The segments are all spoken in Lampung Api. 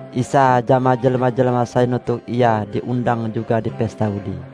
Isa jama jelma-jelma sai nutuk Ia diundang juga di pesta udi.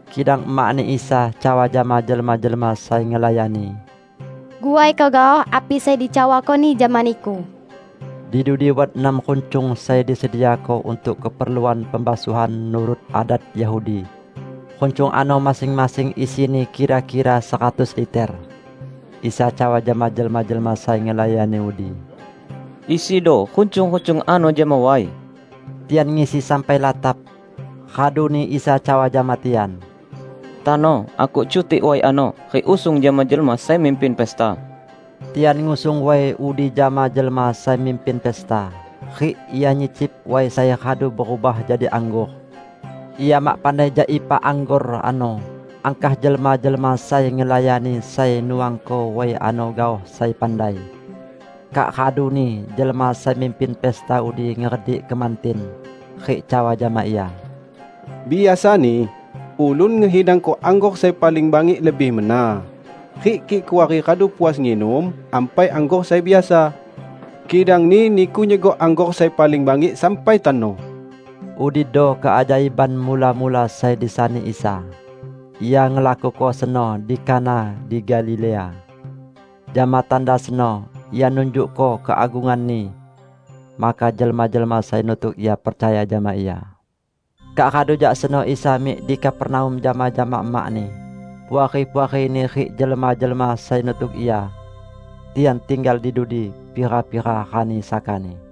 Kidang emak-Ni Isa cawa jama jelma-jelma sai ngelayani, "Guaiko gaoh api sai dicawako-Ni jama niku." Di dudi wat enam runcung sai disediako untuk keperluan pembasuhan nurut adat Yahudi. Runcung ano masing-masing isini kira-kira seratus liter. Isa cawa jama jelma-jelma sai ngelayani udi, "Isido runcung-runcung ano jama way." Tian ngisi sampai latap. Raduni Isa cawa jama tian, "Tano akuk cutik way ano rik usung jama jelma sai mimpin pesta." Tian ngusung way udi jama jelma sai mimpin pesta, rik ia nyicip way sai radu berubah jadi anggor. (Ia mak pandai jak ipa anggor ano, angkah jelma-jelma sai ngelayani sai nuangko way ano gaoh sai pandai). Kak raduni jelma sai mimpin pesta udi ngeredik kemantin, rik cawa jama ia, "Biasani ulun ngehidangko anggor sai paling bangik lebih mena rik kik kuari radu puas nginum, ampai anggor sai biasa. Kidangni Niku nyegok anggor sai paling bangik sampai tano!" Udido keajaiban mula-mula sai disani Isa. Ia ngelakuko seno di Kana di Galilea. Jama tanda seno Ia nunjukko keagungan-Ni. Maka jelma-jelma sai nutuk Ia percaya jama Ia. Kak radu jak seno Isa mik di Kapernaum jama-jama emak-Ni, puari-puari-Ni rik jelma-jelma sai nutuk Ia. Tian tinggal di dudi pira-pira rani sakani.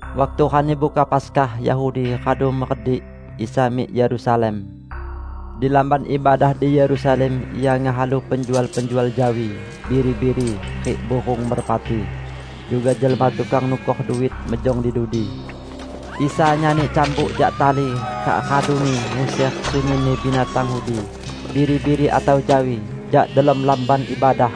Waktu Rani Buka Paskah Yahudi radu meredik, Isa mik Yerusalem. Di Lamban Ibadah di Yerusalem Ia ngehalu penjual-penjual jawi, biri-biri, rik burung merpati; juga jelma tukang nukor duit mejong di dudi. Isa nyani cambuk jak tali kak raduni nguser sunyinni binatang udi, biri-biri atau jawi, jak delom Lamban Ibadah.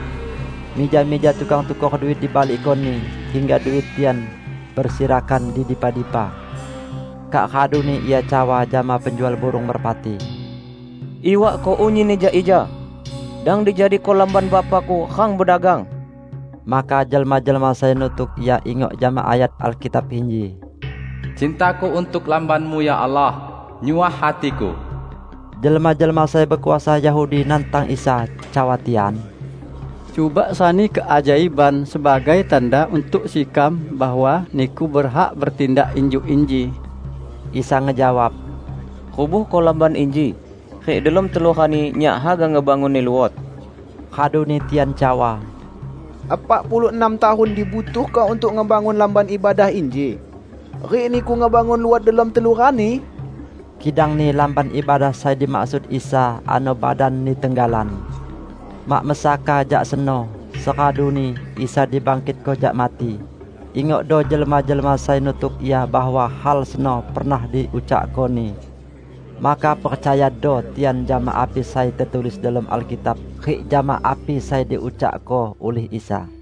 Mija-mija tukang tukor duit dibalikko-Ni hingga duit tian besirakan di dipa-dipa. Kak raduni Ia cawa jama penjual burung merpati, "Iwakko unyinni jak ija. Dang dijadiko Lamban Bapa-Ku rang bedagang!" Maka jelma-jelma sai nutuk Ia ingok jama ayat Alkitab inji, "Cinta-Ku untuk Lamban-Mu, ya Allah, nyuah hati-Ku." Jelma-jelma sai bekuasa Yahudi nantang Isa, cawa tian, "Cuba sani keajaiban sebagai tanda untuk sekam bahwa Niku berhak betindak injuk inji." Isa ngejawab, "Rubuhko Lamban inji, rik delom telu rani Nyak haga ngebangunni luot." Raduni tian cawa, "Epak puluh enam tahun dibutuhko untuk ngebangun Lamban Ibadah inji. Rik Niku ngebangun luot delom telu rani?" Kidangni Lamban Ibadah sai dimaksud Isa ano badan-Ni tenggalan. Mak mesaka jak seno, seraduni Isa dibangkitko jak mati, ingokdo jelma-jelma sai nutuk Ia bahwa hal seno pernah diucakko-Ni. Maka percayado tian jama api sai tetulis delom Alkitab rik jama api sai diucakko ulih Isa.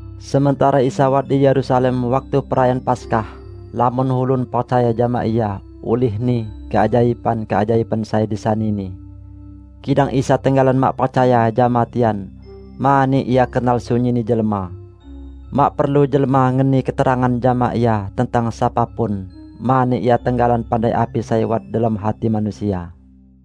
Sementara Isa wat di Yerusalem waktu Perayaan Paskah, lamon ulun percaya jama Ia ulihni keajaiban-keajaiban sai disani-Ni. Kidang Isa tenggalan mak percaya jama tian, mani Ia kenal sunyinni jelma. Mak perlu jelma ngeni keterangan jama Ia tentang sapa pun, mani Ia tenggalan pandai api sai wat delom hati manusia.